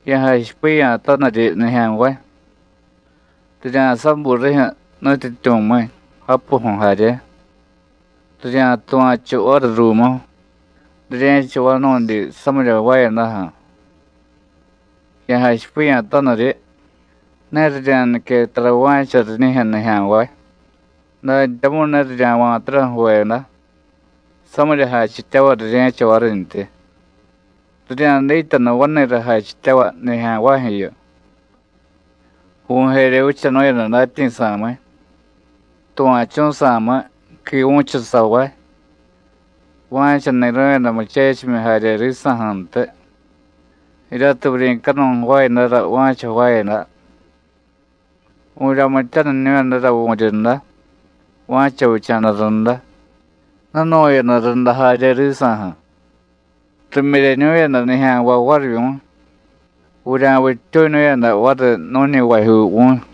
Ya̱jachipiya̱taniryi nijya̱nvay, rirya̱sabuy rijyu̱ nutyityu̱miy, japuju̱ jarye, rirya̱tuva̱chu variy ruumu, rirye̱cha vanu̱dyi samirya jvaayadaju̱. Ya̱jachipiya̱taniryi ne rirya̱nique tara va̱cha riñijyu̱ nijya̱nvay, dantyamu̱y ne rirya̱va̱tara ju̱veda, samirya jachityavay rirye̱cha varintyi, rirya̱dityanu vani̱ra jachityavay nijya̱nvajyu̱yu. Vu̱y jerye vichanu̱yada datyi̱sa̱miy, tuva̱chu̱sa̱miy, quivu̱chusavay, va̱cha ni̱ru̱yada muchechimyi jarye risa̱ju̱ntiy, jiryatiy vuryi̱canuy jvaayadara va̱cha jvaayada; vu̱ryamityaniñu̱yadara vu̱ryunda va̱cha vicha̱da runda, jnunu̱yada runda jarye risa̱ju̱, rimyiryeñu̱yada nijya̱nvay varivyu̱y, vurya̱vittyuñu̱yada variy nu̱ñivajyuu vu̱y.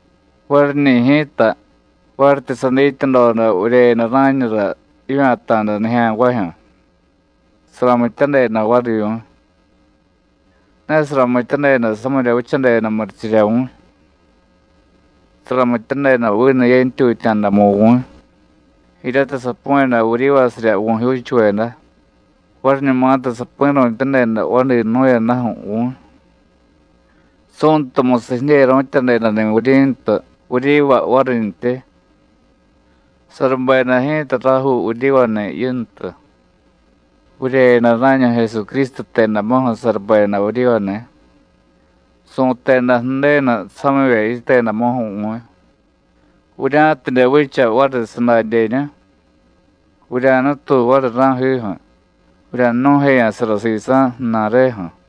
Variñi̱ ji̱ta, varityi sadityadoda vuryeyada rá̱ñura jivya̱ta̱da nijya̱nvajyu̱, saramityadeda varivyu̱y. Ne saramityadeda samirya vichadeda murichirya vu̱y. Saramityadeda vinu ye̱ntyutya̱damu vu̱y, jiryatiy sapu̱yada vuryivasirya vu̱jyuuchuveda variñumatiy sapi̱ru̱tyadeda vadi jnu̱yadaju̱ vu̱y, Su̱ntumusiy jidyeru̱tyadedani̱ vuryi̱ntu vuryiva varintyi. Sarubeda ji̱ta rajuu vuryivani̱ Yintu, vuryeyada rá̱ñu Jesucrístu jtedamuju̱ sarubeda vuryivani̱. Su̱teda Ju̱denu samivye yitedamuju̱ vu̱y, vurya̱tidye vicha variy sadadyeñu, vurya̱nutuy variy ra̱jiju̱ vurya̱jnu̱jeya̱sara sisa̱ ju̱na̱reju̱.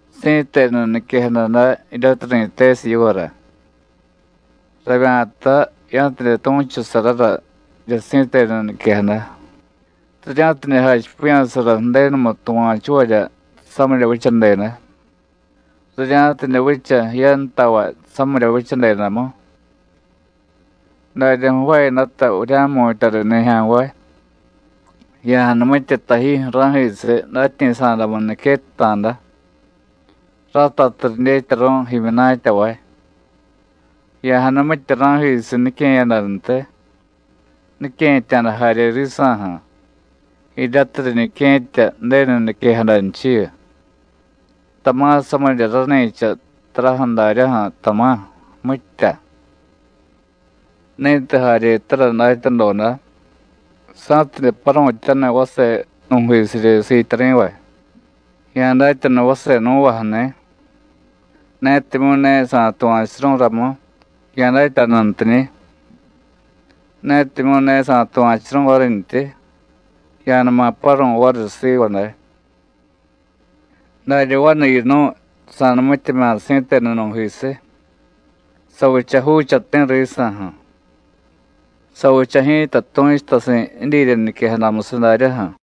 Si̱tenu niquejada day jiryatiy ri̱tesiy yivara. Ravya̱ta ya̱tidye tu̱chusarara jirya si̱tenu niquejada, rirya̱tidye jachipiya̱sara Ju̱denumu tuva̱chuvarya samirya vichadeda, rirya̱tidye vicha jiyantavay samirya vichadedamu. Darya jvaayadata vurya̱jmu̱tya riy nijya̱nvay. Ya̱janumitye tajijyu̱ ra̱jisiy datyi̱sa̱damu niquetta̱da, ratatiy ridyetyaru̱y jimyunatyavay. Ya̱janumitye ra̱jisiy nique̱yadantiy, nique̱tya̱da jarye risa̱ju̱, jiryatiy riñique̱tya Ju̱denu niquejadanchiyu, tama̱ samirya rani̱cha taraju̱ daryaju̱, tama̱, mitya. Ni̱tiy jaryetara datyadoda, sa̱tidye paru̱tyaniy vase nu̱jisiryi siityari̱vay, ya̱datyanu vase nú̱vaju̱ni̱; netimyu̱ ne sa̱tuva̱churu̱y ramu, ya̱datyanuntiñi̱; netimyu̱ ne sa̱tuva̱churu̱y varintyi, ya̱numa paru̱y variy siva day. Darya vanu yinu̱y sa̱numityemya̱ si̱tenu nu̱jisiy, savicha juuchati̱ risa̱ju̱, savicha ji̱ta tu̱chutasi̱ jidyirya niquejadamusiy daryaju̱.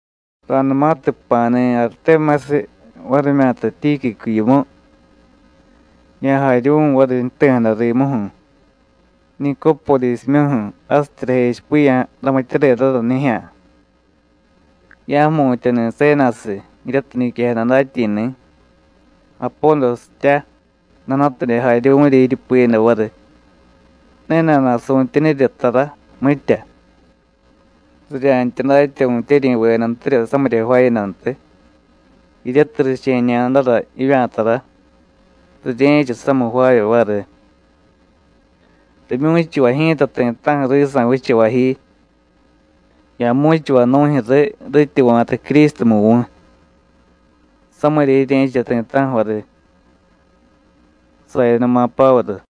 Ra̱numatiy jpa̱ni̱ Aritémasiy varimyata Tíquicu yimu, ya̱jaryuvu̱y variy jti̱jada rimuju̱, Nicópodisimyuju̱ jasityi rajechipiya̱ ramityadedara nijya̱. Ya̱jmu̱tyani̱ Sénasiy jiryatiy niquejada datyi̱ni̱, Apódositya, nana̱tidye jaryuvu̱rya jiryupiyada variy, ne nana̱su̱tyenirya tara, mitya. Rirya̱ntya datya vu̱tyeryi̱vedantirya samirya jvaayadantiy, jiryatiy riche̱ñadara jivya̱tara, rirye̱cha samiy jvaavye variy. Rimyu̱chuvay ji̱ta ti̱ta̱ju̱ risa̱ vichavay ji. Ya̱mu̱chuvay nu̱jyu̱ riy rityi va̱ta Crístumu vu̱y. Samirya jirye̱cha ti̱ta̱ju̱ variy. Sayanuma Pávuru